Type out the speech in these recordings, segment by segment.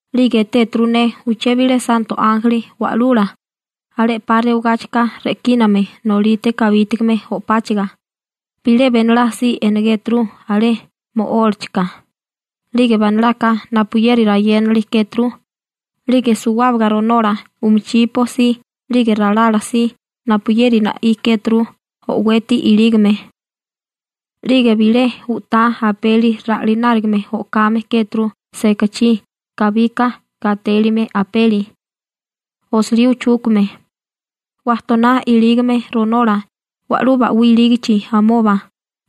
'Lige etéturu ne uché bilé santo ánjeli wa'lula, alé 'pa rewagáchika re'kíname nolite kabítigame o'páchaga, bilé benolá si enegéturu alé mo'ólachika, 'lige banalaka napuyeri rayénali kéturu, 'lige suwábaga ronola (pierna) umichipo si 'lige ralala si napuyeri na'í kéturu o'weti ilígame. 'Lige bilé u'tá apeli ra'linárigame o'kame kéturu sekachí kabika gatélime apeli, osilí uchúkame. Wajtoná ilígame ronola wa'lú ba'wí ilígichi amoba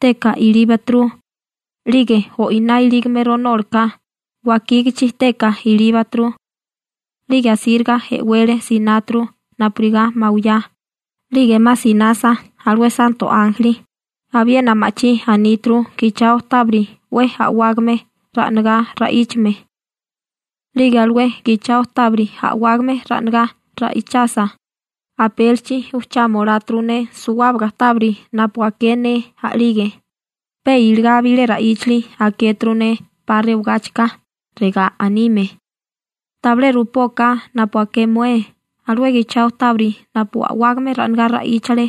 teka ilíbaturu, 'lige o'iná ilígame ronólaká wakígichi teka ilíbaturu. 'Lige asíriga e'wele sináturu napurigá mawiyá, 'lige 'ma sinasa alué santo ánjeli, abiena ma'chí aníturu gichao tábiri 'we a'wágame ra'nagá ra'íchame. 'Lige alué gichao tábiri a'wágame ra'nagá ra'ichasa, apélichi ujchama oláturu ne suwábaga tábiri napu aké ne a'lige, pe iligá bilé ra'íchali akéturu ne 'pa rewagáchika, regá anime: ―Tabilé rupóká napu aké mué alué gichao tábiri napu a'wágame ra'nagá ra'íchale,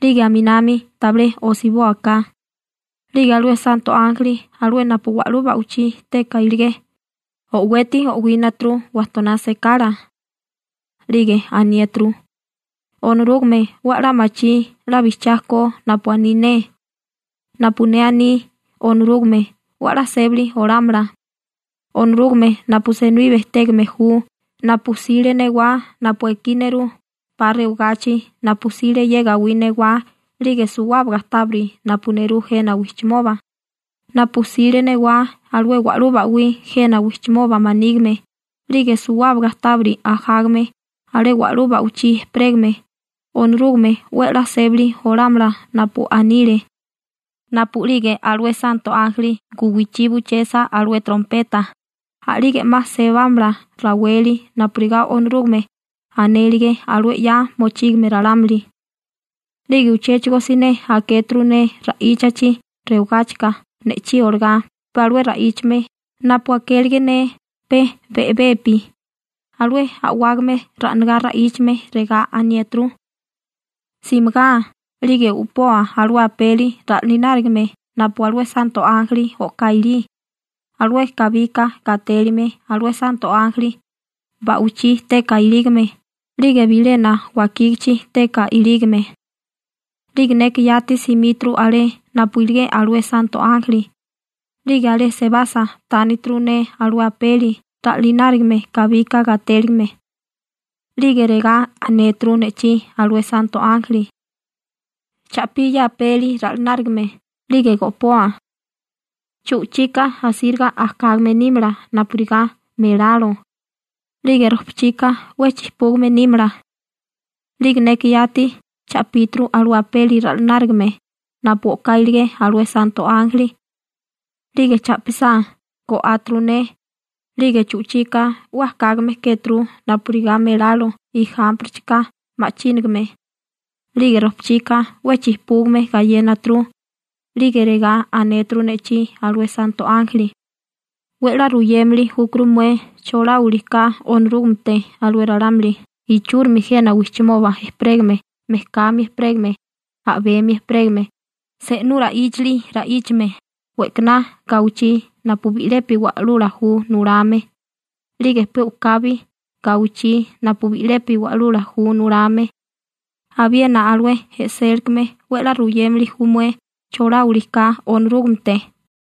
'lige aminami tabilé osibóaká. 'Lige alué santo ánjeli alué napu wa'lú ba'wichí teka iligé o'weti o'wínaturu wajtoná sekala. 'Lige aniéturu: ―Onorúgame 'we 'la machí 'la bijchiá ko napu aní ne. Napu ne aní, Onorúgame 'we 'la sébali olámala. Onorúgame napu senibí bejtégame ju, napu 'sile newá napu ekí nerú 'pa rewagachi, napu 'sile ye gawí newá 'lige suwábaga tábiri napu nerú jena wijchimoba, napu 'sile newá alué wa'lú ba'wí jena wijchimoba manígime 'lige suwábaga tábiri ajágame alé wa'lú ba'wichí ejperégame, Onorúgame 'we 'la sébali olámala napu anile. Napu'lige alué santo ánjeli guwichí buchesa alué trompeta, a'lige 'ma sebámala raweli napurigá Onorúgame anélige alué 'ya mochígame ralámuli. 'Lige uchéchigo siné akéturu ne ra'íchachi rewagáchika ne'chí olagá pe alué ra'íchame napu akélige ne pe be'bepi, alué a'wágame ra'nagá ra'íchame, regá aniéturu: ―Simigá 'lige u'poa alué apeli ra'linárigame napu alué santo ánjeli o'ká ilí, alué kabika gatélime alué santo ánjeli ba'wichí teka ilígame 'lige bilena wakígichi teka ilígame. 'Lige neka yati simíturu alé napu iligé alué santo ánjeli, 'lige alé sebasa tánituru ne alué apeli ra'linárigame kabika gatélime. 'Lige regá anéturu ne'chí alué santo ánjeli: ―Cha'pí ye apeli ra'lanárigame 'lige go'poa. Chu'chika asíriga ajkágame nímala napurigá melalo, 'lige rojpachika 'we chijpúgame nímala. 'Lige neka yati cha'píturu alué apeli ra'lanárigame napu o'ká iligé alué santo ánjeli 'lige cha'pisá go'áturu ne, 'lige chu'chika 'we ajkágame kéturu napurigá melalo ijámpirichika ma'chínigame, 'lige rojpachika 'we chijpúgame gayénaturu. 'Lige regá anéturu ne'chí alué santo ánjeli: ―'We 'la ruyémili júkuru mué choláwili ka Onorúgamete alué ralámuli ichúrimi jena wijchimoba ejperégame, mejkami ejperégame, a'bemi ejperégame, se'nú ra'íchali ra'íchame, we'kaná gawichí napu bi'lepi wa'lula ju nulame, 'lige pe u'kabi gawichí napu bi'lepi wa'lula ju nulame. Abiena alué e'sélikame 'we 'la ruyémili ju mué choláwili ka Onorúgamete.